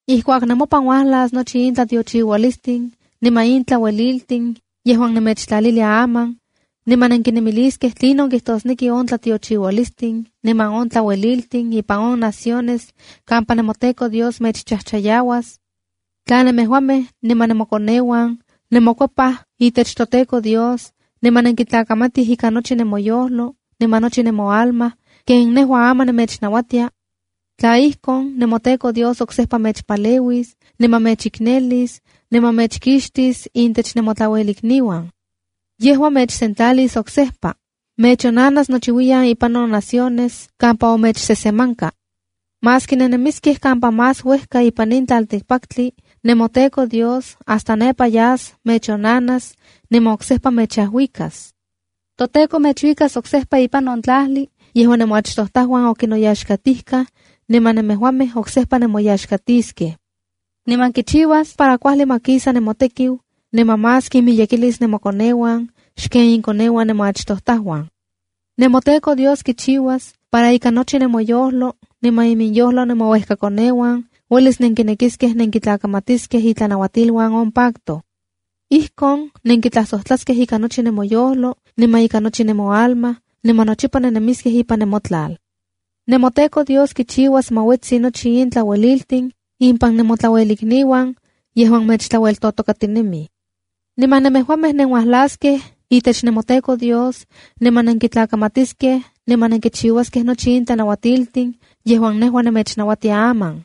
’Ijkuak nemopan uajlas nochi in tlatiochiualistin niman in tlaueliltin yejuan nemechtlalilia aman, niman nenkinemiliskej tlinon kijtosneki on tlatiochiualistin niman on tlaueliltin ipan on naciones kampa nemoTEKO Dios mechchajchayauas, tla nemejuamej niman nemokoneuan nemokuepaj itech toTEKO Dios niman nenkitlakamatij ikan nochi nemoyojlo niman nochi nemoalma ken nejua aman nemechnauatia, tla ijkon, nemoTEKO Dios oksejpa mechpaleuis, niman mechiknelis, niman mechkixtis intech nemotlauelikniuan. Yejua mechsentlalis oksejpa. Mechonanas nochiuiyan impan on naciones kampa omechsesemanka. Maski nennemiskej kampa más uejka ipan in tlaltikpaktli nemoTEKO Dios hasta nepa yas mechonnanas, niman oksejpa mechajuikas. ToTEKO mechuikas oksejpa ipan on tlajli yejuan nemoachtojtajuan okinoyaxkatijkaj, niman nemejuamej oksejpa nemoyaxkatiskej. Niman kichiuas para kuajli ma kisa nemotekiu, niman más kinmiyekilis nemokoneuan xken inkoneuan nemoachtojtajuan. NemoTEKO Dios kichiuas para ika nochi nemomoyojlo niman iminyojlo nemouejkakoneuan uelis nenkinekiskej nenkintlakamatiskej itlanauatiluan on pacto. Ijkon nenkitlajsojtlaskej ika nochi nemoyojlo niman ika nochi nemoalma, niman nochipa nennemiskej ipan nemotlal. ’NemoTEKO Dios kichiuas para ma uetsi nochi in tlaueliltin impan nemotlauelikniuan yejuan mechtlaueltotokatinemij. Niman nemejuamej nenuajlaskej itech nemoTEKO Dios niman nenkitlakamatiskej niman nenkichiuaskej nochi in tlanauatiltin yejuan nejua nemechnauatia aman.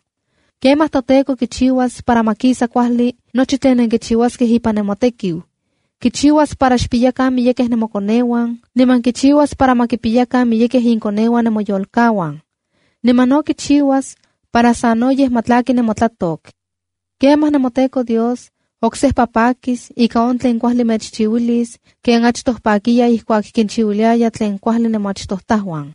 Kemaj toTEKO kichiuas para ma kisa kuajli nochi tlen nenkichiuaskej ipan nemotekiu. Kichiuas para xpiyakan miyekej nemokoneuan, niman kichiuas para ma kipiyakan miyekej inkoneuan nemoyolkauan. Niman no kichiuas para sanoyej ma tlaki nemotlatok. Kemaj, nemoTEKO Dios oksejpa pakis ika on tlen kuajli mechchiuilis, ken achtoj pakiya ijkuak kinchiuiliaya tlen kuajli nemoachtojtajuan.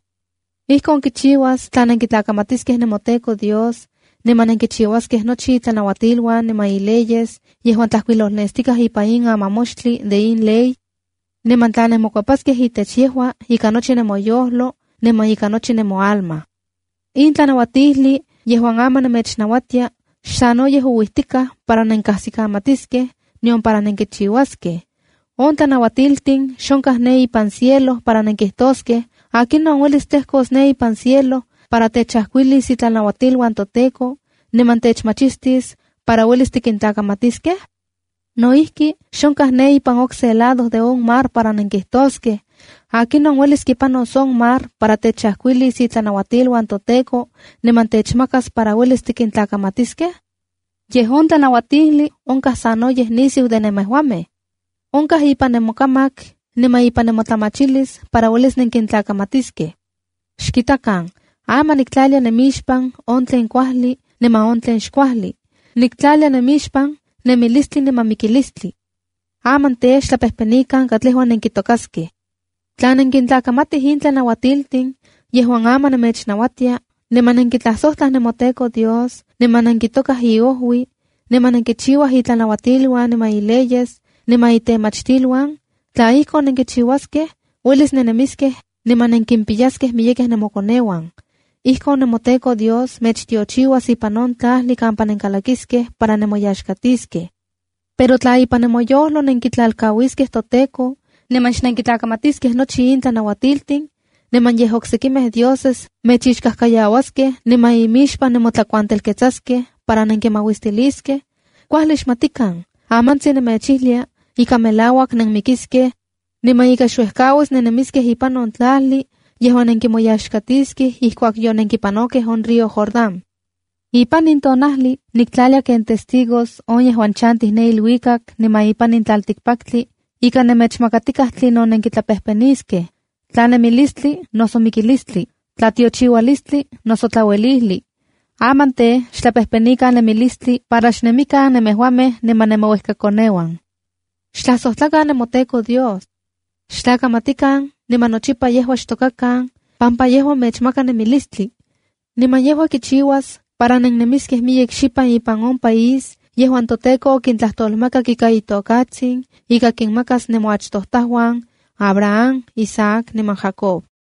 Ijkon kichiuas tla nenkitlakamatiskej nemoTEKO Dios, niman nenkichiuaskej nochi itlanauatiluan niman ileyes yejuan tlajkuilolnestikaj ipan in amamoxtli de in ley, niman tla nenmokuepaskej itech yejua ika nochi nemoyojlo niman ika nochi nemoalma. ’In tlanauatijli yejuan aman nemechnauatia xsanoyej ouijtikaj para nenkasikikamatiskej nion para nenkichiuaskej. In tlanauatiltin xonkaj ne ipan cielo para nenkijtoskej: ‘¿Akinon uelis tlejkos ne ipan cielo para techajkuilis itlanauatiluan toTEKO, niman techmachtis para uelis tikintlakamatiskej?’ No ijki, xonkaj ne ipan on okse lado de on mar para nenkijtoskej: ‘¿Akinon uelis kipanos on mar para techajkuilis itlanauatiluan toTEKO niman techmachtis para uelis tikintlakamatiskej?’ Yej on tlanauatijli onkaj sanoyej nisiu de nemejuamej. Onkaj ipan nemokamak niman ipan nemotlamachilis para uelis nenkintlakamatiskej. ’Xkitakan, aman niktlalia nemixpan on tlen kuajli niman on tlen xkuajli. Niktlalianemixpan nemilistli niman mikilistli. Aman tej, xtlapejpenikan katlejua nenkitokaskej. Tla nenkintlakamatij in tlanauatiltin yejuan aman nemechnauatia niman nenkitlajsojtlaj nemoTEKO Dios niman nenkitokaj iojui, niman nenkichiuaj itlanauatiluan niman ileyes niman itemachtiluan, tla ijkon, uelis nennemiskej niman nenkipiyaskej miyekej nemokoneuan. Ijkon nemoTEKO Dios mechtiochiuas ipan on tlajli kampa nenkalakiskej para nemoyaxkatiskej. Pero tla ipan nemoyojlo nenkitlalkauiskej toTEKO niman xnenkintlakamatiskej nochi in tlanauatiltin, niman yej oksekimej dioses mechixkajkayauaskej niman imixpan nemotlakuantelketsaskej para nenkinmauistiliskej, kuajli xmatikan, amantsin nemechijlia ika melauak nenmikiskej, niman ika xuejkauis nennemiskej ipan on tlajli yejuan nenkimoyaxkatiskej ijkuak yonenkipanokej on río Jordán. ’Ipan in tonajli nikintlalia ken testigos on yejuan chantij ne iluikak niman ipan in tlaltikpaktli, ika nemechmakatikaj tlinon nenkitlapejpeniskej: tla nemilistli noso mikilistli, tlatiochiualistli noso tlauelijli. Aman tej, xtlapejpenikan nemilistli para xnemikan nemejuamej niman nemouejkakoneuan. Xtlajsojtlakan nemoTEKO Dios. Xtlakamatikan niman nochipa yejua xtokakan pampa yejua mechmaka nemilistli, niman yejua kichiuas para nennemiskej miyek xipan ipan on país yejuan toTEKO okintlajtolmakak ika itokatsin ika kinmakas nemoachtojtajuan, Abraham, Isaac niman Jacob.”